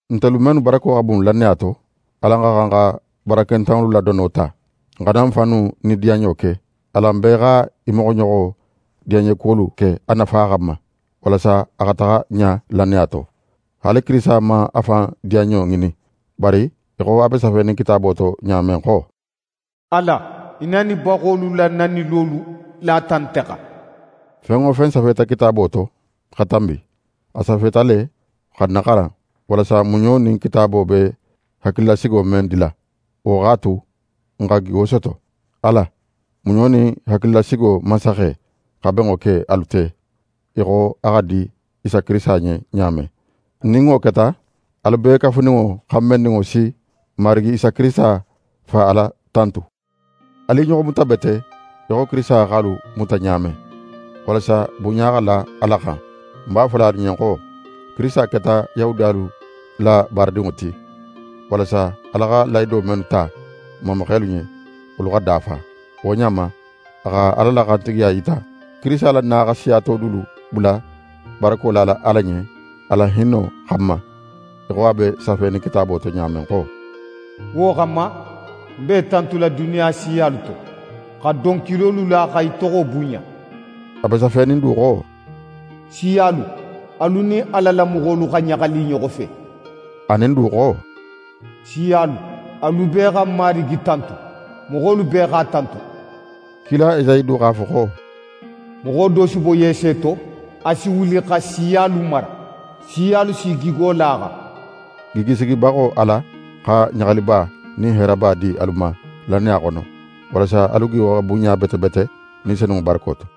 Ntelu mennu barako xa bun lannaya to, alan xa xan xa barakentanŋolu la dono ta. N xana n fannu diyanɲo ke. Alan bee xa í moxoɲoxo diyanɲekuwolu ke a nafa xanma, walasa a xa taxa ɲa lannaya to. Haali Kirisita man a fan diyanɲo ŋinin, bari í xo a be safenin Kitaabo to ɲa men xo: «Ala, í nanibaxolu la nanilolu lata nte xan.» Fen wo fen safeta Kitaabo to xa tanbi, a safeta le xa n naxaran, walasa muɲo nin Kitaabo be hakililasigo men dila, wo x'a tu n xa gigo soto. Ala, muɲo nin hakililasigo Mansaxe, xa benŋo ke alu te, í xo a xa di Isa Kirisita ɲen ɲa men. Nin wo keta, alu bee kafuninŋo xanbenninŋo si n Marigi Isa Kirisita Fa Ala tantu. Alu i ɲoxo muta bete í xo Kirisita x'alu muta ɲa men, walasa bunɲa xa la Ala xan. Ń b'a fola alu ɲen xo, Kirisita keta Yahudiyalu la baaradinŋo ti, walasa Ala xa lahido mennu ta i mamaxelu ɲen, wolu xa dafa. Wo ɲa ma, a xa Ala la xantigiya yita. Kirisita la na xa siya to dulu bula barako lala Ala ɲen a la hinno xanma, í xo a be safenin Kitaabo to ɲa men xo: «Wo xanma, ń be í tantula duniya siyalu to, xa donkilolu la xa í toxo bunɲa.» A be safenin du xo: «Siyalu, alu nin Ala la moxolu xa ɲaxali i ɲoxo fe.» Anin du xo: «Siyalu, alu bee xa Marigi tantu. Moxolu bee x'a tantu.» Kila Esayi du x'a fo xo: «Moxo do si bo Yese to. A si wuli xa siyalu mara. Siyalu s'i gigo la a xan.» Gigisigibaxo Ala xa ɲaxaliba nin heeraba di alu ma lannaya xono, walasa alu gigo xa bunɲa bete bete, Ni Senunŋo barako to.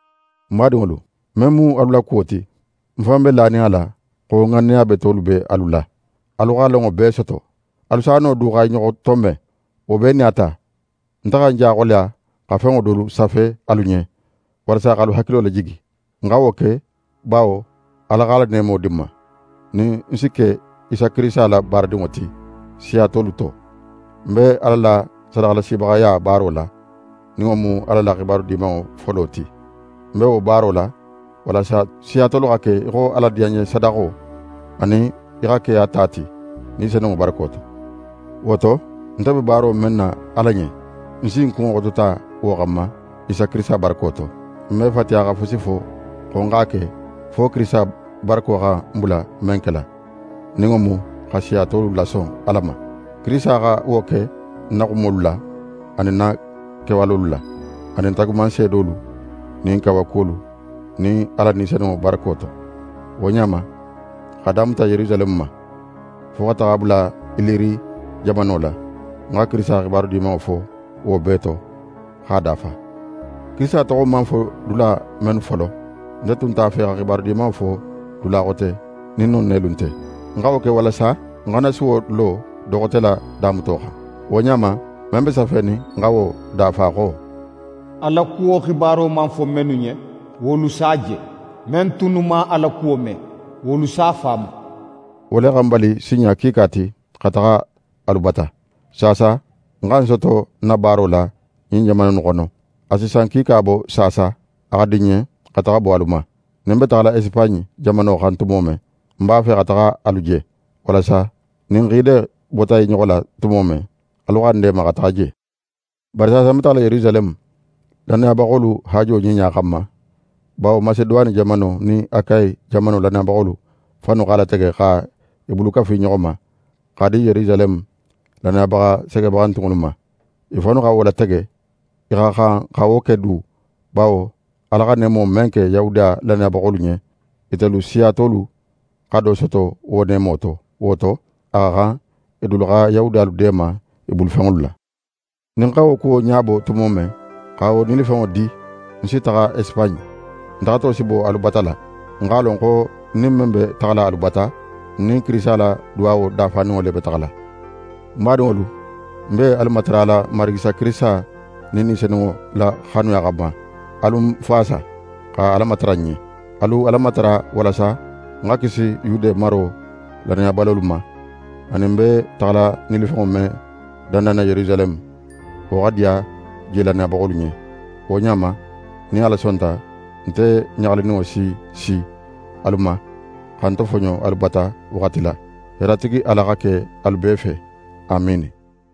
Ń badinŋolu, men mu alu la kuwo ti, ń fan be lanin a la xo ŋanneya betolu be alu la. Alu xa lonŋo bee soto. Alu s'a no du xa i ɲoxo tonben. Wo bee nin a ta, nte xa ń ja xoleya xa fenŋo dolu safe alu ɲen, walasa x'alu hakilo lajigi. Ń xa wo ke, bawo Ala x'a la neemo di ń ma, nin ń si ke Isa Kirisita la baaradinŋo ti siya tolu to. Ń be Ala la sadaxalasibaxaya baaro la, nin wo mu Ala la xibaru Dimanŋo folo ti. Ń be wo baaro la, walasa siya tolu xa ke í xo Ala diyanɲesadaxo, anin i xa ke a ta ti, Ni Senunŋo barako to. Wo to, nte be baaro men na Ala ɲen, ń si ń kunŋo xotota wo xanma, Isa Kirisita barako to. Ń me fatiya xa fusi fo xo ń x'a ke, fo Kirisita barako xa ń bula men kela, nin wo mu xa siya tolu lason Ala ma. Kirisita xa wo ke ń na xumolu la, anin ń na kewalolu la, anin taagumanseedolu nin kawakuwolu nin Ala Ni Senunŋo barako to. Wo ɲa ma, x'a damuta Yerusaleme ma, fo xa taxa a bula Iliri jamano la, ń xa Kirisita Xibaru Dimanŋo fo wo bee to, x'a dafa. Kirisita toxo man fo dula mennu folo, nte tun nte a fe xa Xibaru Dimanŋo fo dula xote nin non nelu nte. Ń xa wo ke walasa ń xana suwo lo do xote la damuto xan. Wo ɲa ma, men be safenin, ń xa wo dafa xo: «A la kuwo xibaro man fo mennu ɲen, wolu s'a je. Men tunnu man a la kuwo me, wolu s'a faamu.» Wo le xa ń bali sinɲa kiika ti xa taxa alu bata. Saasa, ń xa ń soto ń na baaro la ɲin jamana innu xono. A si san kiika bo saasa, a xa di ń ɲen xa taxa bo alu ma. Nin ń be taxala Esipaɲe jamano xan tumo men, ń b'a fe xa taxa alu je, walasa nin n xiide bota i ɲoxo la tumo men, alu xa ń deema xa taxa je. Bari saasa ń be taxala Yerusaleme, lannayabaxolu haajo ɲiɲa xanma. Bawo Maseduwane jamano nin Akayi jamano lannayabaxolu fannu x'a latege xa i bulu kafu i ɲoxo ma, x'a di Yerusaleme lannayabaxa segebaxantunŋolu ma. I fannu xa wo latege. I xa xan xa wo ke du, bawo Ala xa neemo men ke Yahudiya lannayabaxolu ɲen, itelu siya tolu xa do soto wo neemo to. Wo to, a xa xan i dulu xa Yahudiyalu deema i bulufenŋolu la. Nin ń xa wo kuwo ɲabo tumo men, xa wo nilifenŋo di, ń si taxa Esipaɲe. Ń taxato si bo alu bata la. Ń x'a lon xo nin ń be taxala alu bata, ń nin Kirisita la duwawo dafaninŋo le be taxala. Ń badinŋolu, ń be alu matarala n Marigi Isa Kirisita nin Ni Senunŋo la xanuya xanma, alu ń faasa, xa Ala matara ń ɲen. Alu Ala matara walasa ń xa kisi Yude maro lannayabalolu ma, anin ń be taxala nilifenŋo men dandanna Yerusaleme, wo xa diya je lannayabaxolu ɲen. Wo ɲa ma, nin Ala sonta, nte ɲaxalininŋo si si alu ma, xa ń tofoɲo alu bata waxati la. Heeratigi Ala xa ke alu bee fe. Amiini.